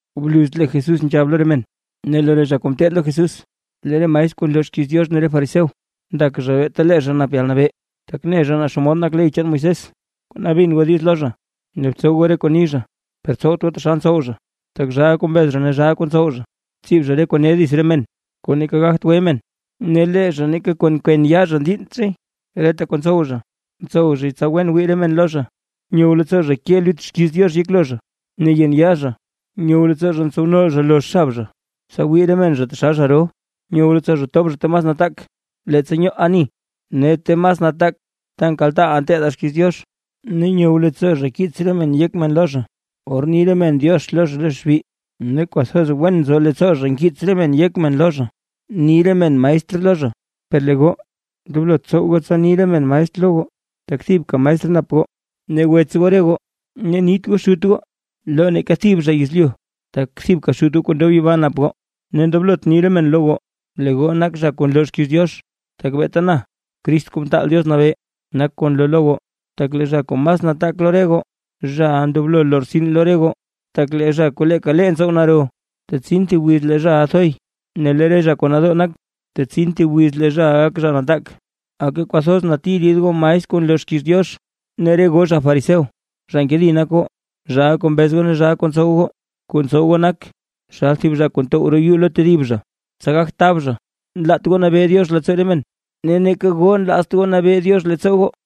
Bluz lee Jesús nzhab lo re men, ne lo re zha kuu ngeteed lo Jesús: ―Lee re maestr kuu nloo xkiiz Diox ne re fariseo, ndak zha beeta lee zha nap yalnabee, tak ne zha naa xomod nak ley chaan Moisés. Kona bin goo diiz lo zha ne btsow goo re kuu ni zha. Per tsowt goo taxal ntsow zha, tak zhaa kuu mbez zha ne zhaa kuu ntsow zha. Ntsib zha re kuu ne dits re men, kuu neeka gagt gwe men, ne lee zha neeka kwen yaa zha ndiinnt zhay. Reta kuu ntsow zha, ntsow zhay tsa wen wii re men lo zha. Nyow leettsoo zha ke lut xkiiz Diox yeklo zha ne yen yaa zha. Nyow leettsoo zha ntsow nol zha lozh xab zha, tsa wii re men zha taxal zha ro. Nyow leettsoo zha tob zha ta mas nataak leettsa nyoo ani, ne ta mas nataak ta nkaltaaʼaa nteedaa xkiiz Diox. Ne nyow leettsoo zha kiits re men yek men lo zha, or ni re men “diox” lo zha lo xbi, ne kwathoz wen nzo leettsoo zha nkiits re men yek men lo zha ni re men “maestr” lo zha. ’Per lee goo, ndoblot tsow goo tsa ni re men maestr lo goo, tak thibka maestr nap goo ne wets goo re goo. Ne nit goo xut goo lo neeka thib zha yezlyu, tak thibka xut goo kuu ndob yibaa nap goo. Ne ndoblot ni re men lo goo, “lee goo nak zha kuu nloo xkiiz Diox” tak beeta na Crist Kuu Mtaal Diox Nabee, nak kuu nloo lo goo. Tak lee zha kuu mas nataak lo re goo, zhaʼa ndoblo lortsin lo re goo. Tak lee zha kuu leeka lee ntsow naro, tetsin thib wiz lee zhaʼa thoy; ne lee re zha kuu nadoo nak, tetsin thib wiz lee zhaʼa gak zha nataak. ’¡Aka kwathoz nati rid goo maestr kuu nloo xkiiz Diox, ne re goo zha fariseo! ¡Zha nkedi nak goo, zhaa kuu mbez ne zhaa kuu ntsow goo! Kuu ntsow goo nak taxal thib zha kuu ntow roo yuu lo tedib zha, tsa gagt tab zha. Nlaat goo nabee Diox leettsoo re men, ne neeka goo nlaazt goo nabee Diox leettsoo goo.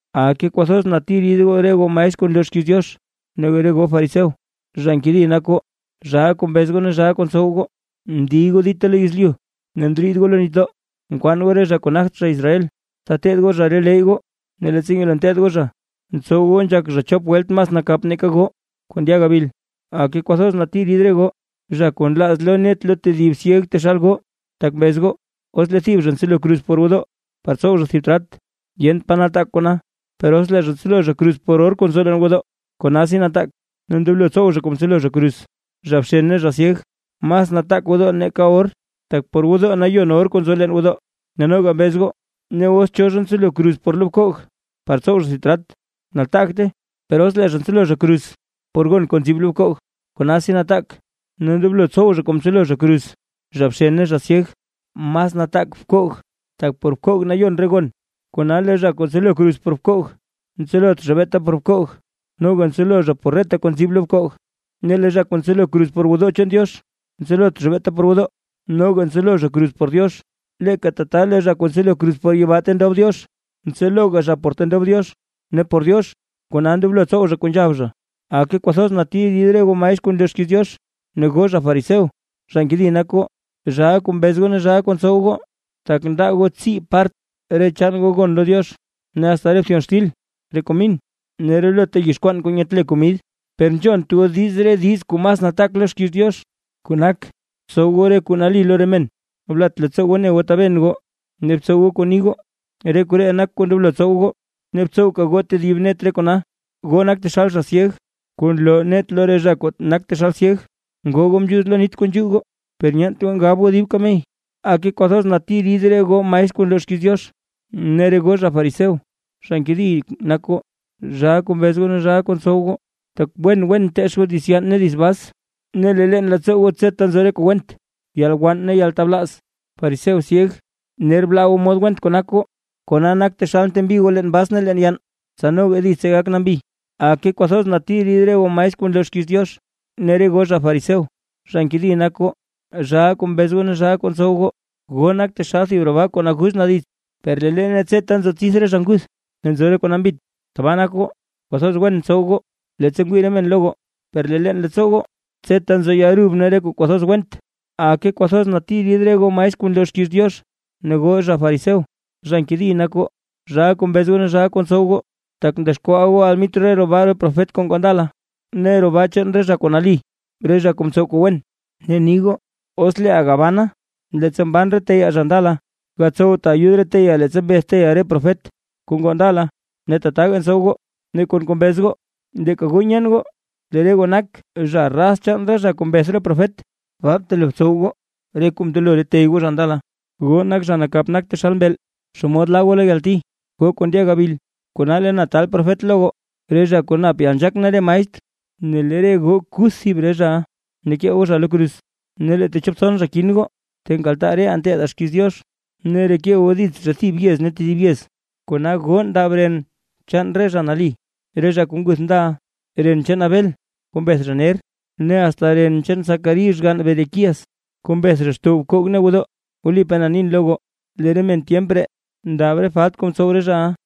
’¡Aka kwathoz nati rid goo maestr kuu nloo xkiiz Diox ne goo fariseo! ¡Zha nkedi nak goo, zhaa kuu mbez goo ne zhaa kuu ntsow goo! Ndiy goo dita lo yezlyu ne ndriid goo lo nitdoo, nkwaan goo re zha kuu nagt zha Israel, tsa teteed goo zha re leyy goo, ne leettsa nyelo nteteed goo zha, ntsow goo nzhak zha chop welt mas nakap nake goo kuu ndya gabil. ’¡Aka kwathoz nati rid goo, zha kuu nlaaz loo net lo tedib syeg taxal goo! Tak mbez goo: “Os lee thib zha ntselo kruz por gwodoo, par tsow zha thib trat, yent pa nataak kona. Per os lee zha ntselo zha kruz por or kuu nzo leen gwodoo, konasi nataak ne ndoblo tsow zha kuu mtselo zha kruz.” ¡Zha bxen ne zha syeg! Mas nataak gwodoo nake or, tak por gwodoo nayon or kuu nzo leen gwodoo. Ne noga mbez goo: “Os cho zha ntselo kruz por bkoog par tsow zha thib trat, nataagte. Per os lee zha ntselo zha kruz por gon kuu nzib lo bkoog, konasi nataak ne ndoblo tsow zha kuu mtselo kruz zha.” ¡Zha bxen ne zha syeg! Mas nataak bkoog, tak por bkoog nayon re gon. Kona lee zha kuu ntselo kruz por bkoog, ntselot zha beeta por bkoog, noga ntselo zha por reta kuu nzib lo bkoog. Ne lee zha kuu ntselo kruz por gwodoo chaan Diox, ntselot zha beeta por gwodoo, noga ntselo zha kruz por Diox. Leeka tata, lee zha kuu ntselo kruz por yibaa ta ndob Diox, ntseloga zha por ta ndob Diox, ne por Diox, kona ndoblo tsow zha kuu nzhab zha. ’¡Aka kwathoz nati rid goo maestr kuu nloo xkiiz Diox ne goo zha fariseo! ¡Zha nkedi nak goo, zhaa kuu mbez goo ne zhaa kuu ntsow goo! Tak ndaa goo tsii part re chaan goo gon lo Diox, ne asta re bthyon xtil, re komin ne relota yizh kwaan kuu nyetle komid. Per nzhont goo diiz re diiz kuu mas nataak lo xkiiz Diox, kuu nak: Tsow goo re kuu nali lo re men, blat leettsoo goo ne goo taben goo, ne btsow goo kuu ni goo. Re koree nak kuu ndoblo tsow goo, ne btsowka goo tedib net re kona. ¡Goo nak taxal zha syeg kuu nloo net lo re zha kuu nak taxal syeg; ngoo goo mzhuuz leen nit kuu nzhuu goo, per nyeent goo ngab goo dib kamey! ’¡Aka kwathoz nati rid goo maestr kuu nloo xkiiz Diox ne re goo zha fariseo! ¡Zha nkedi nak goo, zhaa kuu mbez goo ne zhaa kuu ntsow goo! Tak wen wen nteech goo dits yann ne dits bas, ne lee leen leettsoo goo tseta nzo re kuu went: yalwann ne yaltablaaz. ¡Fariseo syeg! Ner blaa goo mod went kuu nak goo, kona nak taxal ntembi goo leen bas ne leen yann, tsa noga ditse gak nambi. ’¡Aka kwathoz nati rid goo maestr kuu nloo xkiiz Diox ne re goo zha fariseo! ¡Zha nkedi nak goo, zhaa kuu mbez ne zhaa kuu ntsow goo! Goo nak taxal thib roo baa kuu naguz na dits, per lee leene tseta nzo tsidth re zha nguth, ne nzo re kuu nambit. Tbaa nak goo; kwathoz wen ntsow goo leettsa ngwii re men lo goo, per lee leen leettsoo goo tseta nzo yalrub ne re kuu kwathoz went. ’¡Aka kwathoz nati rid goo maestr kuu nloo xkiiz Diox ne re goo zha fariseo! ¡Zha nkedi nak goo, zhaa kuu mbez goo ne zhaa kuu ntsow goo! Tak ndexkwaa goo almitr roo baa chaan re profet kuu ngoo ndala, ne re roo baa chaan re zha kuu nali, re zha kuu mtsow kuu wen, ne ni goo: “Os leeʼaa gabanaa, leettsa mban re teyaa zha ndala, gatsowtaa ayud re teyaa leettsa mbeth re teyaa re profet kuu ngoo ndala, ne tataga ntsow goo”. Ne kon kuu mbez goo, leeka goo nyeen goo lee re goo nak zha raz chaan re zha kuu mbeth re profet. Baa btelo btsow goo goo re kuu mndelo re tey goo zha ndala. ’¡Goo nak zha nakap nak taxal mbeel! ¿Xomod laa goo lo yalti, goo kuu ndya gabil? Kona lee na taal profet lo goo, re zha kuu nap yalnzhaak ne re maestr. Ne lee re goo kuth thib re zhaʼa, ne kee goo zha lo kruz, ne lee techop tson zha kin goo, ta nkaltaa reʼaa nteedaa xkiiz Diox, ne reke goo dits zha thib yez ne tedib yez. Kona goo ndab ren chaan re zha nali, re zha kuu nguth ndala. Ren chaan Abel kuu mbeth zha ner, ne asta ren chaan Zacarí xgann Berequías, kuu mbeth zha xtow bkoog ne gwodoo. Wlipaa na nin lo goo, lee re men tyemp ree ndab re falt kuu mtsow re zhaʼa.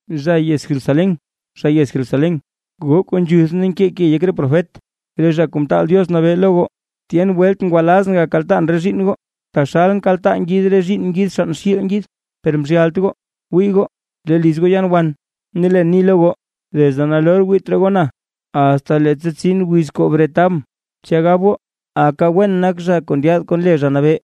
’¡Zha yez Jerusalén, zha yez Jerusalén, goo kuu nzhuth ne nkee ke yek re profet, re Zha Kuu Mtaal Diox Nabee lo goo! Tyen welt ngwalazʼn gakaltaan re zhiinn goo, taxal nkaltaa ngid re zhiinn ngid xann xiil ngid, per mzhyalt goo. Wii goo, lee liz goo yaan wan. Ne leen ni lo goo, desde nalor wiit raa goo na, asta leettsa tsin wiz kuu bretabʼn, tsya gab goo: “¡Aka wen nak zha kuu ndyaad kon le Zha Nabee!”